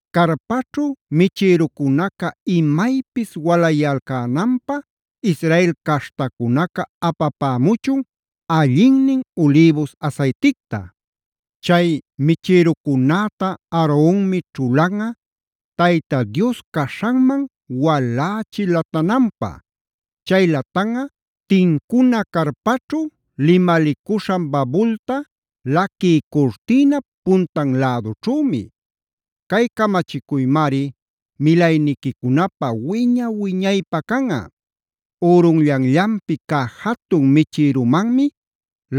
“Carpaćhu michïrucunaca imaypis walayalcänanpä Israel caśhtacunaca apapämuchun allinnin ulïbus asayticta. Chay michïrucunäta Aaronmi ćhulanꞌa Tayta Dios caśhanman walächi latananpä. Chay latanꞌa tincuna carpaćhu limalicuśhan babulta laquï curtïnap puntan lädućhümi. Cay camachicuymari milayniquicunapä wiña-wiñaypä canꞌa. Ürunllanllanpi cä jatun michïrümanmi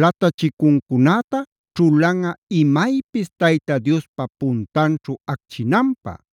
latachicuncunäta ćhulanꞌa imaypis Tayta Diospa puntanćhu acchinanpä.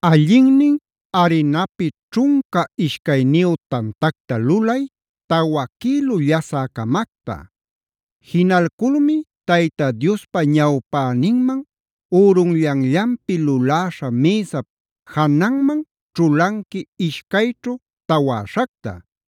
“Allinnin arinapi ćhunca ishcayniyu tantacta lulay, tawa quïlu llasä-camacta. Jinalculmi Tayta Diospa ñawpäninman ürunllanllanpi luläśha mïsap jananman ćhulanqui ishcayćhu tawäśhacta;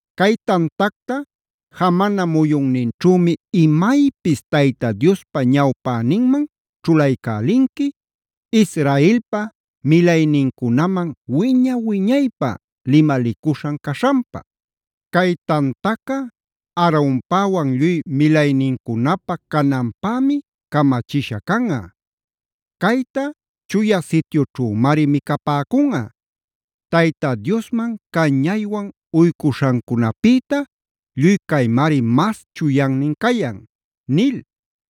Cay tantacta jamana muyunninćhümi imaypis Tayta Diospa ñawpäninman ćhulaycälinqui, Israelpa milaynincunaman wiña-wiñaypä limalicuśhan caśhanpa. Cay tantaca Aaronpäwan lluy milaynincunapä cananpämi camachisha canꞌa.b Cayta Chuya Sityućhümari micapäcunꞌa. Tayta Diosman cañaywan uycuśhancunapïta lluy caymari mas chuyannin cayan” nil.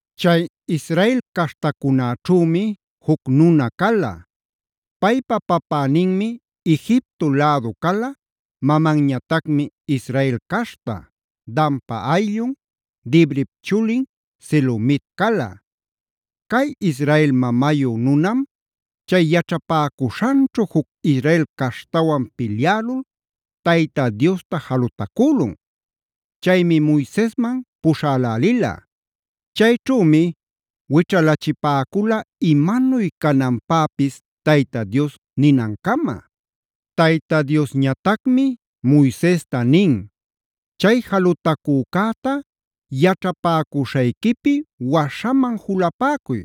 Chay Israel caśhtacunäćhümi juc nuna cala. Paypa papäninmi Egipto lädu cala, mamanñatacmi Israel caśhta, Danpa ayllun, Dibrip chulin Selomit cala. Cay Israel mamayu nunam chay yaćhapäcuśhanćhu juc Israel caśhtawan pilyälul Tayta Diosta jalutacülun. Chaymi Moisesman puśhalälila. Chayćhümi wićhalachipäcula imanuy cananpäpis Tayta Dios ninancama. Tayta Diosñatacmi Moisesta nin: “Chay jalutacücäta yaćhapäcuśhayquipi waśhaman julapäcuy.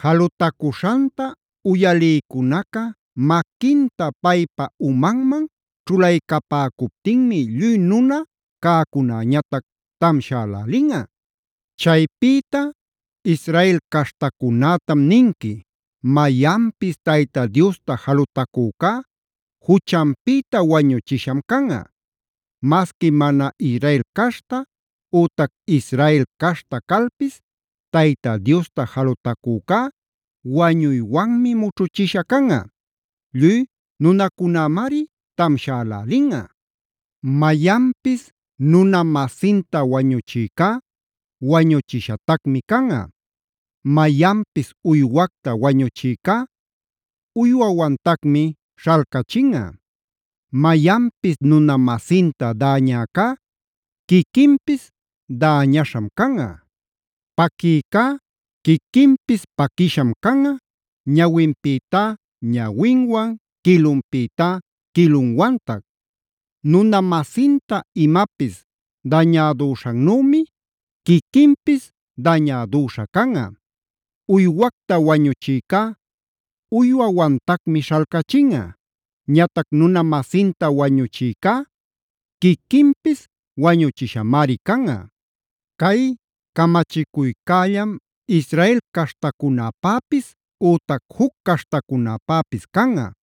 Jalutacuśhanta uyalïcunaca maquinta paypa umanman ćhulaycapäcuptinmi lluy nuna cäcunäñatac tamshälälinꞌa. Chaypïta Israel caśhtacunätam ninqui: ‘Mayanpis Tayta Diosta jalutacücá juchanpïta wañuchisham canꞌa. Masqui mana Israel caśhta ütac Israel caśhta calpis Tayta Diosta jalutacücá wañuywanmi mućhuchisha canꞌa; lluy nunacunämari tamshälälinꞌa. “ ‘Mayanpis nuna-masinta wañuchïcá wañuchishatacmi canꞌa.c “ ‘Mayanpis uywacta wañuchïcá uywawantacmi śhalcachinꞌa. “ ‘Mayanpis nuna-masinta däñäcá quiquinpis däñaśham canꞌa: Paquïcá quiquinpis paquisham canꞌa, ñawinpïtá ñawinwan, quilunpïtá quilunwantac.d Nuna-masinta imapis dañädüśhannümi quiquinpis dañädüśha canꞌa. “ ‘Uywacta wañuchïcá uywawantacmi śhalcachinꞌa. Ñatac nuna-masinta wañuchïcá quiquinpis wañuchishamari canꞌa. “ ‘Cay camachicuycällam Israel caśhtacunapäpis ütac juc caśhtacunapäpis canꞌa.e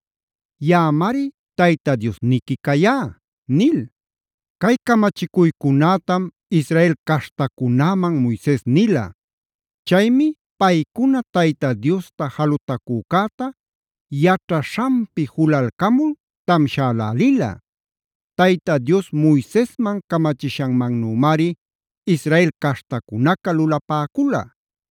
Yaꞌamari Tayta Diosniqui cayá’” nil. Cay camachicuycunätam Israel caśhtacunäman Moises nila. Chaymi paycuna Tayta Diosta jalutacücäta yaćhaśhanpi julalcamul tamshälälila. Tayta Dios Moisesman camachishanmannümari Israel caśhtacunaca lulapäcula.